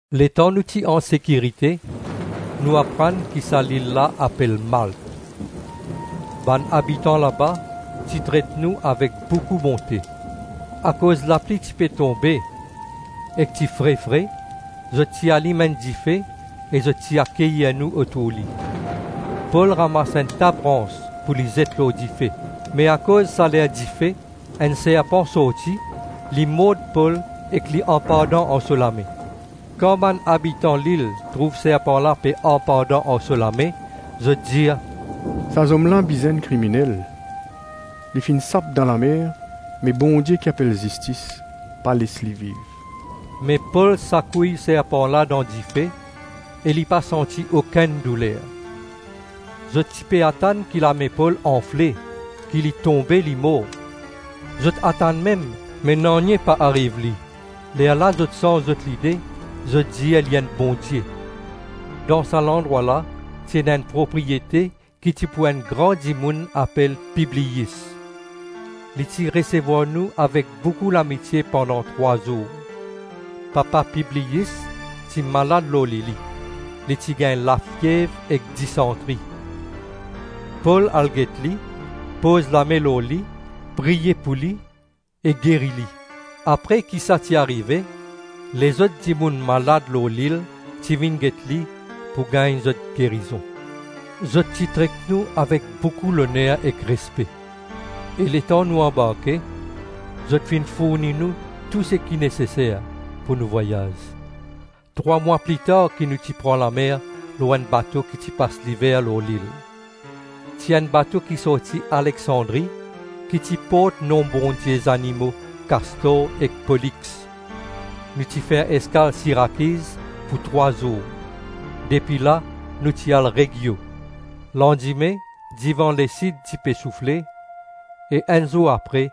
Letan nou ti ansekirite, nou aprann ki sa lil la apel Malt. Bann abitan laba ti tret nou avek boukou bonte. Akoz lapli ti pe tonbe ek ti fre-fre, zot ti alim enn dife ek zot ti akeyir nou otour li. Pol ramas enn ta brans pou li zet lor dife, me akoz saler dife enn serpan sorti, li mord Pol ek li anpandan ar so lame. Kan bann abitan lil trouv serpan la pe anpandan ar so lame, zot dir, “Sa zom la bizin enn kriminel. Li finn sap dan lamer, me bondie ki apel Zistis pa les li viv.” Me Pol sakouy serpan la dan dife, e li pa santi okenn douler. Zot ti pe atann ki lame Pol anfle, ki li tonbe, li mor. Zot atann mem, me nanye pa ariv li. Lerla zot sanz zot lide, zot dir li enn bondie. Dan sa landrwa la ti ena enn propriyete ki ti pou enn gran dimoun apel Pibliyis. Li ti resevwar nou avek boukou lamitie pandan trwa zour. Papa Pibliyis ti malad lor lili, li ti gagn lafiev ek disantri. Pol al get li, poz lame lor li, priye pou li, e geri li. Apre ki sa ti arive, lezot dimoun malad lor lil ti vinn get li pou gagn zot gerizon. Zot ti tret nou avek boukou loner ek respe, e letan nou anbarke, zot finn fourni nou tou seki neseser pou nou vwayaz. Trwa mwa plitar ki nou ti pran lamer lor enn bato ki ti pas liver lor lil. Ti enn bato ki sorti Aleksandri, ki ti port nom bondie zimo Kastor ek Polix. Nou ti fer eskal Sirakiz pou trwa zour. Depi la nou ti al Reggio. Landime divan lesid ti pe soufle e enn zour apre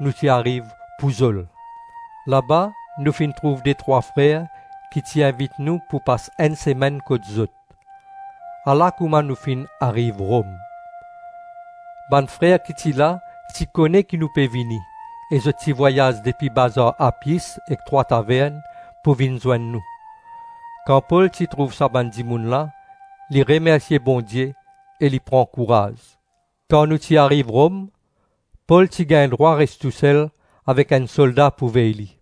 nou ti ariv Pouzol. Laba nou finn trouv detrwa frer ki ti invit nou pou pas enn semenn kot zot. Ala kouma nou finn ariv Rom. Bann frer ki ti la, ti kone ki nou pe vini e zot ti vwayaz depi Bazar Apyis e Trwa Tavern pou vinn zwenn nou. Kan Pol ti trouv sa bann dimoun la, li remersie Bondie e li pran kouraz. Kan nou ti ariv Rom, Pol ti gagn drwa res tousel avek enn solda pou vey li.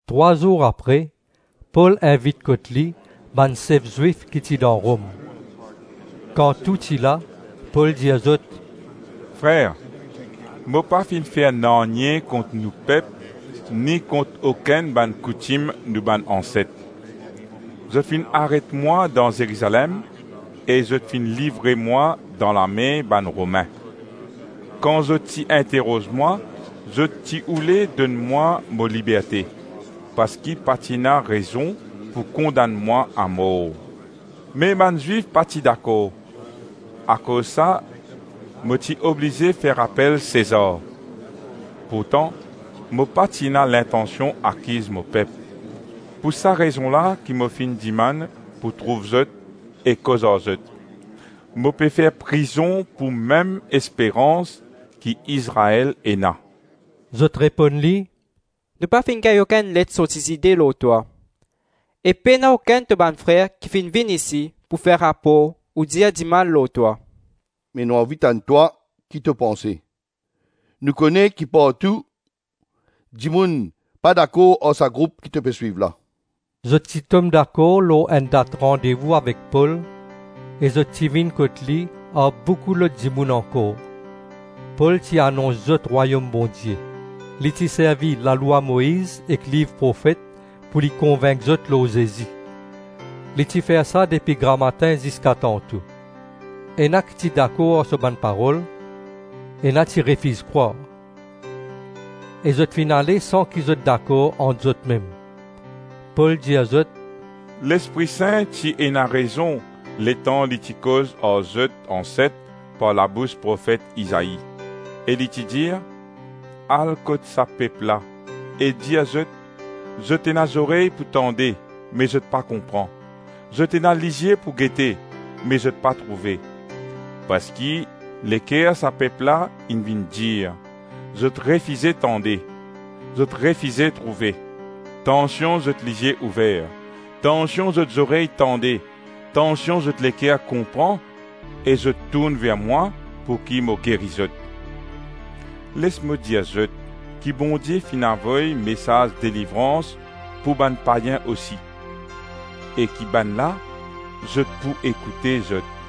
Trwa zour apre, Pol invit kot li bann sef Zwif ki ti dan Rom. Kan tou ti la, Pol dir zot, “Frer, mo pas finn fer nanye kont nou pep ni kont okenn bann koutim nou bann anset. Zot finn aret mwa dan Zerizalem e zot finn livre mwa dan lame bann Romin. Kan zot ti interoz mwa, zot ti oule donn mwa mo liberte, parski pa ti ena rezon pou kondann mwa amor. Me bann Zwif pa ti dakor, akoz sa mo ti oblize fer apel Sezar; pourtan mo pa ti ena lintansion akiz mo pep. Pou sa rezon la ki mo finn dimann pou trouv zot e koz ar zot. Mo pe fer prizon pou mem esperans ki Izrael ena.” Zot reponn li, “Nou pa finn gagn okenn let sorti Zide lor twa, e pena okenn to bann frer ki finn vinn isi pou fer rapor ou dir dimal lor twa. Me nou anvi tann twa, ki to panse. Nou kone ki partou dimoun pa dakor ar sa group ki to pe swiv la.” Zot ti tom dakor lor enn dat randevou avek Pol, e zot ti vinn kot li ar boukou lot dimoun ankor. Pol ti anons zot Rwayom Bondie. Li ti servi lalwa Moiz ek liv profet pou li konvink zot lor Zezi. Li ti fer sa depi gramatin ziska tanto. Ena ki ti dakor ar so bann parol, ena ti refiz krwar. E zot finn ale san ki zot dakor ant zotmem. Pol dir zot, “Lespri Sin ti ena rezon letan li ti koz ar zot anset par labous profet Izai, e li ti dir: ‘Al kot sa pep la, e dir zot: Zot ena zorey pou tande, me zot pa konpran; zot ena lizie pou gete me zot pa trouve. Parski leker sa pep la inn vinn dir, zot refize tande, zot refize trouve; tansion zot lizie ouver, tansion zot zorey tande, tansion zot leker konpran, e zot tourn ver mwa pouki mo geri zot.’ Les mo dir zot ki Bondie finn avoy mesaz delivrans pou bann payin osi, e ki bannla, zot pou ekoute, zot.” [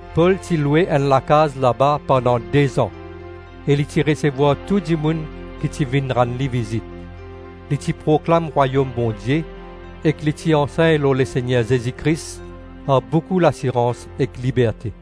Pol ti lwe enn lakaz laba pandan de-zan, e li ti resevwar tou dimoun ki ti vinn rann li vizit. Li ti proklam Rwayom Bondie, ek li ti ansegn lor Lesegner Zezi Kris ar boukou lasirans ek liberte.